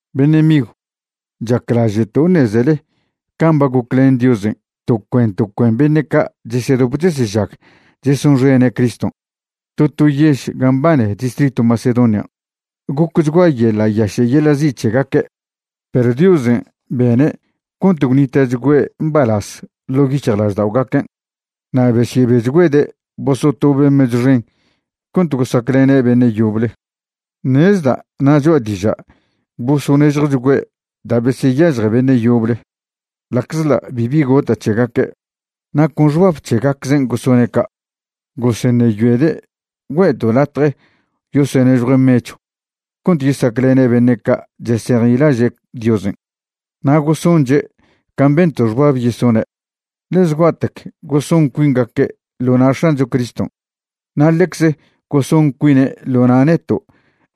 Beṉe' migw, chaclaže'to' ṉezele can' ba goclen Diosen' to cuen to cuen beṉe' ca' chesedop chesežag chesonxene' Criston' to to yež gan' mbane distritw Macedonian'. Gocchgua yeḻa' yaše' yeḻa' zi' c̱hegaque', perw Diosen' bene' cont gwnita'chgüe' mbalaz ḻo' yic̱hjlažda'ogaquen' na' besyebechgüede' bosotobe' mechw xen cont gosaclene' beṉe' yoble. Ṉezda' na' choa' diža' bosonežjochgüe' da' beseyažje beṉe' yoble ḻa'czḻa' bibi gota' c̱hegaque', na' con xbab c̱hegaczen' gosone' ca'. Goseṉeyoede' güe'to' latje yosonežjue' mechw cont yesaclene' beṉe' ca' chesejnilaže' Diosen'. Na' gosonche' can' bento' xbab yesone', ḻe zgua'tec goson cuingaque' ḻo na' X̱ancho Criston' na' ḻecze goson cuine' ḻo na' neto'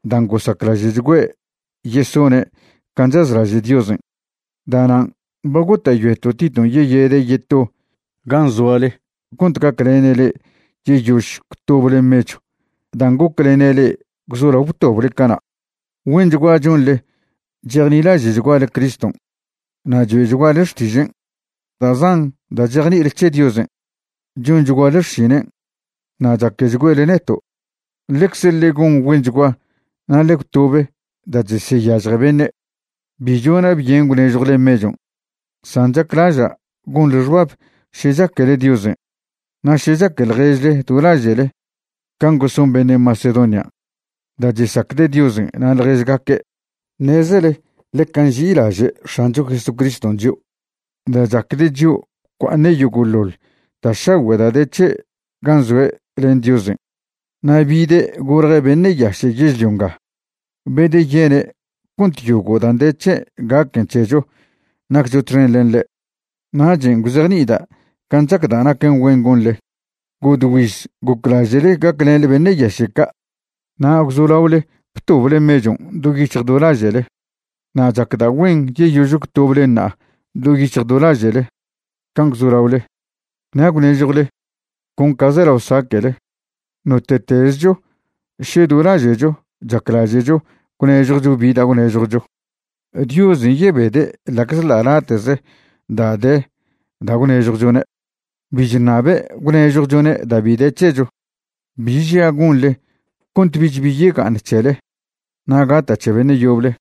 dan' gosaclaže'chgüe' yesone' can' chazlaže' Diosen'. Da'nan' ba gota'yoeto' Titon' yeyede' yeto gan' zoale cont gaclene' le'e yeyož gwtoble mechw dan' goclene' le'e gwzolao btoble cana'. Güenchgua chonḻe chejnilaže'chguale Criston' na' choe'chguale xtižen', da' zan da' chejni'ile c̱he Diosen', chonchguale xšinen', na' chaquechgüele neto'. Ḻecze ḻe gon güenchgua na' ḻe gwtobe da' cheseyažje beṉe'. Bi chona' byen gwnežjwle mechon', san chaclaža' gonḻe xbab še chaquele Diosen' na' še chaque ḻježle do laže'le can' goson beṉe' Macedonian' da' chesacde' Diosen' na' ḻježgaque'. Ṉezele ḻeca nži'ilaže' X̱ancho Jesucriston' chio'. Da' chacde' chio' bcua'aṉe' yogo'ḻoḻ da' šagüe' da' de c̱he' gan' zoe' len Diosen' na' bide' golje' beṉe' yaše' yežlio nga, bedeyene' cont yogo' dan' de c̱he' gaquen c̱hecho naccho txen len ḻe'. Nachen' gwzejni'ida' can' chacda' naquen güen gonḻe. Godgüiz goclaže'le gaclenḻe beṉe' yaše' ca' na' gwzolaole btoble mechon' do yic̱hj do laže'le. Na' chacda' güen yeyož gwtoblen ṉa'a do yic̱hj do laže'le can' gwzolaole, na' gwnežjwle con ca zelao saque'le. Note'tezcho še do laže'cho chaclaže'cho gwnežjwcho bi da' gwnežjwcho, Diosen' yebede' ḻa'czḻa' late'ze da' de da' gwnežjwchone'. Bi chṉabe' gwnežjwchone' da' bi de c̱hecho. Bi žia' gonḻe cont bich bi yega'aṉ c̱hele na' gata' c̱he beṉe' yoble.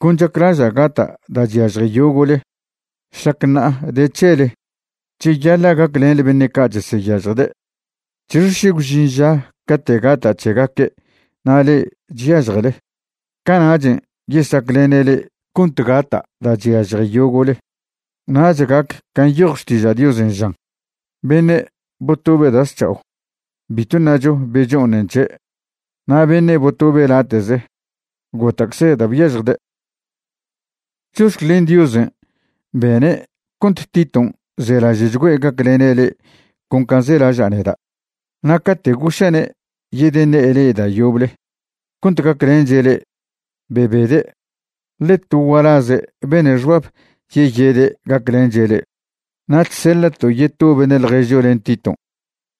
Con chaclaža' gata' da' chyažje yogo'le. Šlac ṉa'a de c̱he le'e, cheyaḻa' gaclenḻe beṉe' ca' cheseyažjde'. ¿C̱hixe še gwžin ža cate' gata' c̱hegaque' na' le'e chyažjele? Cana'chen' yesaclene' le'e cont gata' da' chyažje yogo'le. Nach gac can' nyoj Xtiža' Diosen' žan: “Beṉe' botobe' da' zc̱ha'o, bitw ṉacho becho'oṉen c̱he', na' beṉe' botobe' late'ze, gota'cze da' byažjde'.” Chox̱clen Diosen' bene' cont Titon' zelaže'chgüe' gaclene' le'e con can' zelaža' neda'. Na' cate' goša'ne' yedeṉe'e le'e da' yoble cont gaclenche' le'e, bebede', ḻe to gualaze' bene' xbab yeyede' gaclenche' le'e. Na' chseḻa'to' yeto beṉe' ḻježcho len Titon'.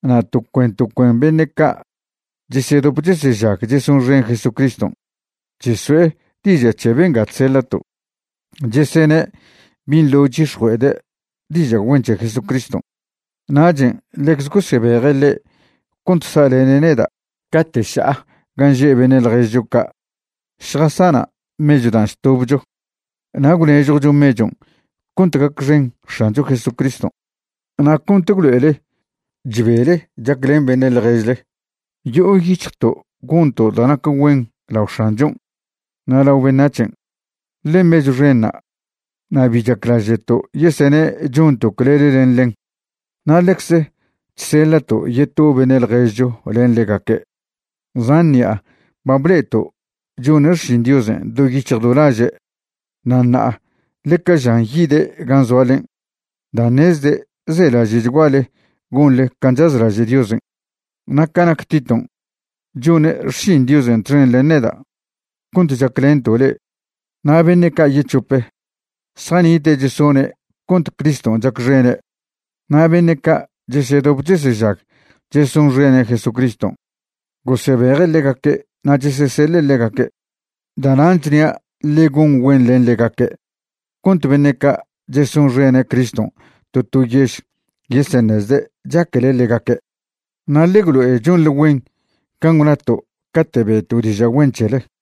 Na' to cuen to cuen beṉe' ca' chesedop chesežag chesonxen Jesucriston' cheso'e diža' c̱he benga chseḻa'to', chesene' binḻo chyix̱jue'ede' diža' güen c̱he Jesucriston'. Nachen' ḻecze gosebeje' ḻe' cont sa'lene' neda' cate' ša'a gan' že' beṉe' ḻježcho ca' šjasana' mechw dan' chtobcho. Na' gwnežjwcho mechon' cont gacxen X̱ancho Jesucriston' na' cont gwlo'ele chbele chaclen beṉe' ḻježle. Yo'o yic̱hjto' gonto' da' nac güen lao X̱anchon' na' lao beṉac̱hen', ḻe mechw xenṉa', na' bi chaclaže'to' yesene' chonto' clele len ḻen. Na' ḻecze chseḻa'to' yeto beṉe' ḻježcho len ḻegaque'. Zan ṉi'a ba ble'eto' chone' xšin Diosen' do yic̱hj do laže' na' ṉa'a ḻeca žan yide' gan' zoalen' da' ṉezde' zelaže'chguale gonḻe can' chazlaže' Diosen'. Na' ca nac Titon', chone' xšin Diosen' txen len neda' cont chaclento' le'e. Na' beṉe' ca' yec̱hope, zjanite' chesone' cont Criston' chacxene', na' beṉe' ca' chesedop chesežag chesonxene' Jesucriston' gosebeje' ḻegaque' na' cheseseḻe' ḻegaque'. Da'nan' chnia' ḻe gon güen len ḻegaque' cont beṉe' ca' chesonxene' Criston' to to yež yeseṉezde' chaquele ḻegaque', na' ḻe gwlo'e chonḻe güen can' gwnato' cate' be'to' diža' güen c̱hele.